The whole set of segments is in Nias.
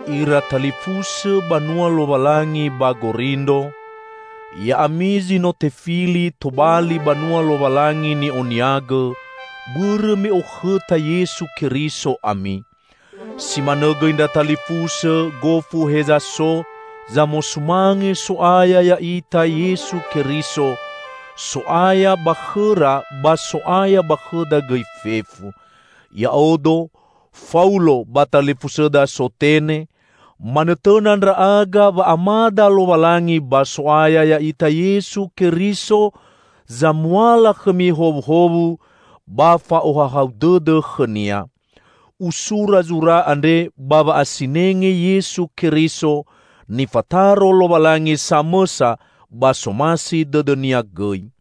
Ira talifusõ banua Lowalangi ba Gorindro! Ya'ami zi no tefili tobali banua Lowalangi ni'oniagõ, bõrõ me okhõta Yesu Keriso ami! Si manõ gõi ndra talifusõ gofu heza so zamosumange So'aya ya'ita Yesu Keriso, So'aya ba khõra ba So'aya ba khõda gõi fefu. Ya'odo, Faulo ba talifusõda Sotene, manõtõna ndra'aga wa Amada Lowalangi ba So'aya ya'ita Yesu Keriso zamuala khõmi howuhowu ba fa'ohahau dõdõ khõ-Nia. Usura zura andre ba wa'asinenge Yesu Keriso, nifataro Lowalangi samõsa ba somasi dõdõ-Nia gõi.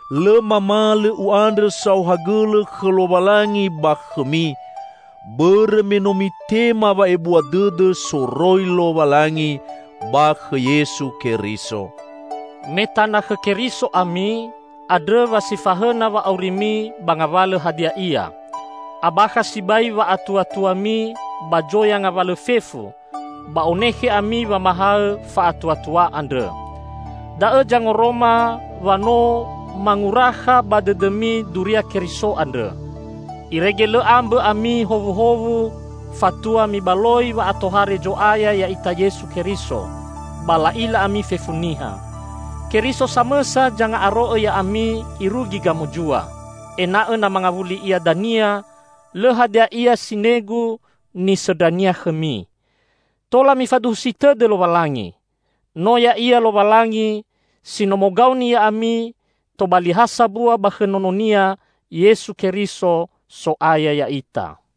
Lõ mamalõ u'andrõ saohagõlõ khõ Lowalangi ba khõmi, bõrõ me no mitema wa'ebua dõdõ soroi Lowalangi ba khõ Yesu Keriso. Me tana khõ Keriso ami, andrõ wa si fahõna wa'aurimi ba ngawalõ hadia ia. Abakha sibai wa'atuatuami ba zoya ngawalõ fefu ba onekhe ami wamahaõ fa'atuatua andrõ. Da'õ zangoroma wa no mangurakha ba dõdõmi duria Keriso andrõ. Irege lõ ambõ ami howuhowu fatua mibaloi wa'atohare Zo'aya ya'ita Yesu Keriso, ba la'ila ami fefu niha. Keriso samõsa zanga'aro'õ ya'ami irugi gamozua; ena'õ na mangawuli Ia dania, lõ hadia ia sinegu nisõndra-Nia khõmi. Tola mifaduhusi tõdõ Lowalangi. No Ya'ia Lowalangi si no mogaoni ya'ami tobali ha sambua ba khõ Nono-Nia, Yesu Keriso, So'aya ya'ita.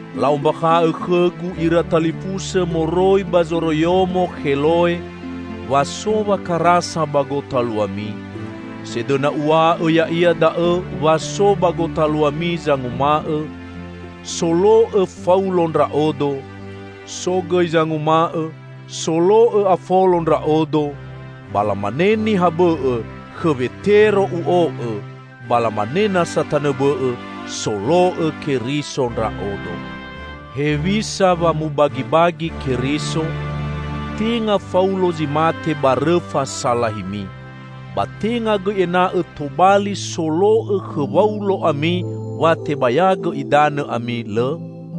La'ombakha'õ khõgu ira talifusõ moroi ba zoroiyomo Kheloe wa so wakarasa ba gotaluami. Sedõna uw̃a'õ ya'ia da'õ wa so ba gotaluami zanguma'õ, "Solo'õ Faulo ndra'odo," so gõi zanguma'õ, "Solo'õ Afolo ndra'odo," ba lamane niha bõ'õ, "Khõ Wetero u'o'õ," ba lamane nasa tanõ bõ'õ, "Solo'õ Keriso ndra'odo." Hewisa wa mubagibagi Keriso? Tenga Faulo zi mate ba rõfa salahimi! Ba tenga gõi ena'õ tobali solo'õ khõ Waulo ami wa tebayagõ idanõ ami, lõ?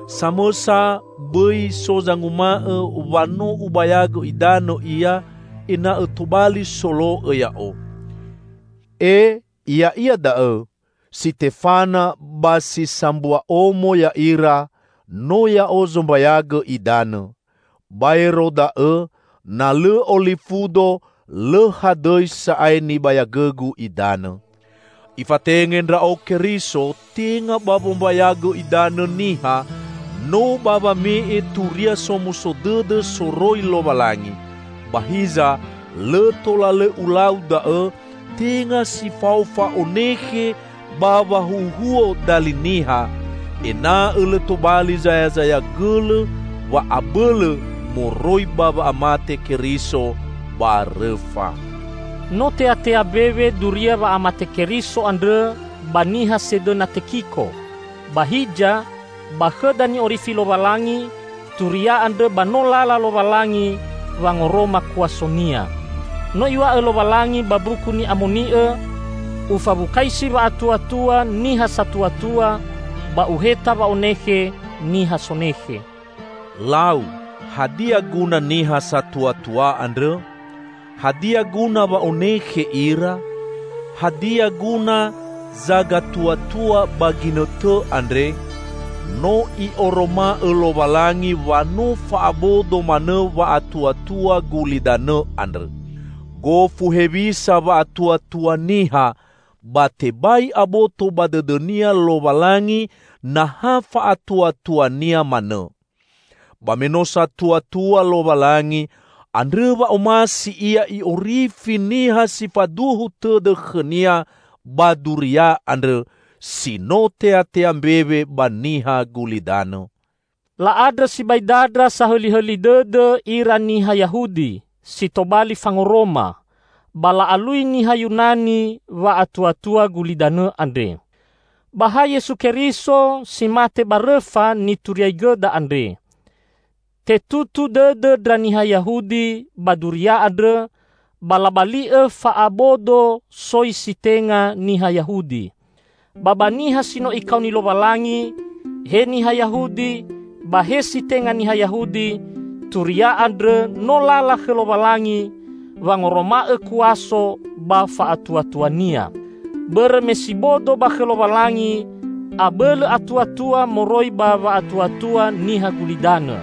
Samõsa bõi so zanguma'õ wa no ubayagõ idanõ ia ena'õ tobali solo'õ ya'o. (Ee, ya'ia da'õ! Sitefana ba si sambua omo ya'ira no ya'o zombayagõ idanõ. Baero da'õ, na lõ olifudo lõ hadõi sa'ae nibayagõgu idanõ.) Ifatenge ndra'o Keriso tenga ba wombayagõ idanõ niha, no ba wame'e Turia Somuso Dõdõ soroi Lowalangi; ba hiza lõ tola lõ ulau da'õ tenga si fao fa'onekhe ba wahuhuo dali niha, ena'õ lõ tobali zayazaya gõlõ wa'abõlõ moroi ba wa'amate Keriso ba rõfa. No teatea mbewe duria wa'amate Keriso andrõ ba niha sedõna tekiko. Ba hiza, ba khõda ni'orifi Lowalangi, turia andrõ ba no lala Lowalangi wangoroma kuaso-Nia. No Iw̃a'õ Lowalangi ba Mbuku Ni'amoni'õ, "Ufawukaisi wa'atuatua niha satuatua, ba uheta wa'onekhe niha sonekhe." Lau, hadia guna niha satuatua andrõ? Hadia guna wa onekhe ira? Hadia guna zagatuatua ba ginõtõ andre? No I'oroma'õ Lowalangi wa no fa'abodo manõ wa'atuatua gulidanõ andrõ! Gofu hewisa wa'atuatua niha, ba tebai aboto ba dõdõnia Lowalangi na ha fa'atuatuania manõ. Ba me no satuatua Lowalangi, andrõ wa omasi Ia I'orifi niha si faduhu tõdõ khõ-Nia ba duria andrõ si no teatea mbewe ba niha gulidanõ. La'andrõ sibai dandra sahõlihõli dõdõ ira niha Yahudi si tobali fangoroma, ba la'alui niha Yunani wa'atuatua gulidanõ andre. Ba ha Yesu Keriso si mate ba rõfa nituriaigõda andre. Tetutu dõdõ ndra niha Yahudi ba duria andrõ, ba labali'õ fa'abodo soi si tenga niha Yahudi. Ba ba niha si no Ikaoni Lowalangi -- he niha Yahudi ba he si tenga niha Yahudi -- turia andrõ no lala khõ Lowalangi wangoroma'õ kuaso ba fa'atuatua-Nia. Bõrõ me si bodo ba khõ Lowalangi, abõlõ atuatua moroi ba wa'atuatua niha gulidanõ;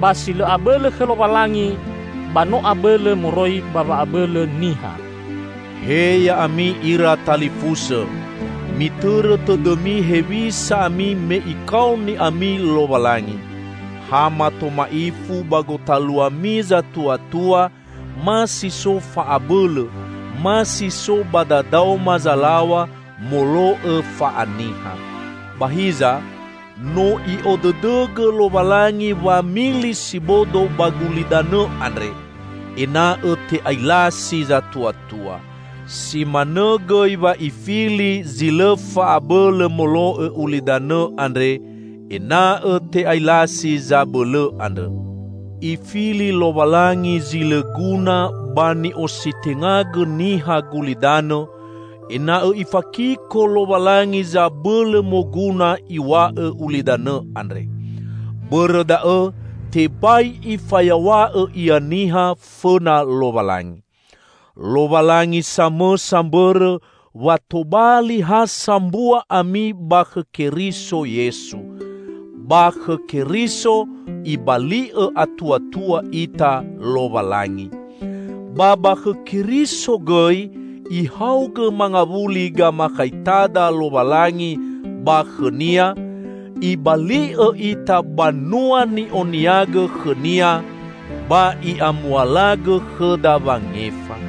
ba si lõ abõlõ khõ Lowalangi, ba no abõlõ moroi ba wa'abõlõ niha. He ya'ami ira talifusõ! Mitõrõ tõdõmi hewisa ami me Ikaoni ami Lowalangi. Ha mato ma'ifu ba gotaluami zatuatua, ma si so fa'abõlõ, ma si so ba dadaoma zalaw̃a molo'õ fa'aniha. Ba hiza, no I'odõdõgõ Lowalangi wamili si bodo ba gulidanõ andre, ena'õ te'ailasi zatuatua. Si manõ gõi wa Ifili zi lõ fa'abõlõ molo'õ ulidanõ andre, ena'õ te'ailasi zabõlõ andrõ. Ifili Lowalangi zi lõ guna ba ni'ositengagõ niha gulidanõ, ena'õ Ifakiko Lowalangi zabõlõ moguna iw̃a'õ ulidanõ andre. Bõrõ da'õ tebai ifayaw̃a'õ ia niha fõna Lowalangi. Lowalangi samõsa mbõrõ wa tobali ha sambua ami ba khõ Keriso Yesu. Ba khõ Keriso Ibali'õ atuatua ita Lowalangi. Ba ba khõ Keriso gõi Ihaogõ mangawuli gamakhaitada Lowalangi ba khõ-Nia, Ibali'õ ita banua ni'oniagõ khõ-Nia ba I'amualagõ khõda wangefa.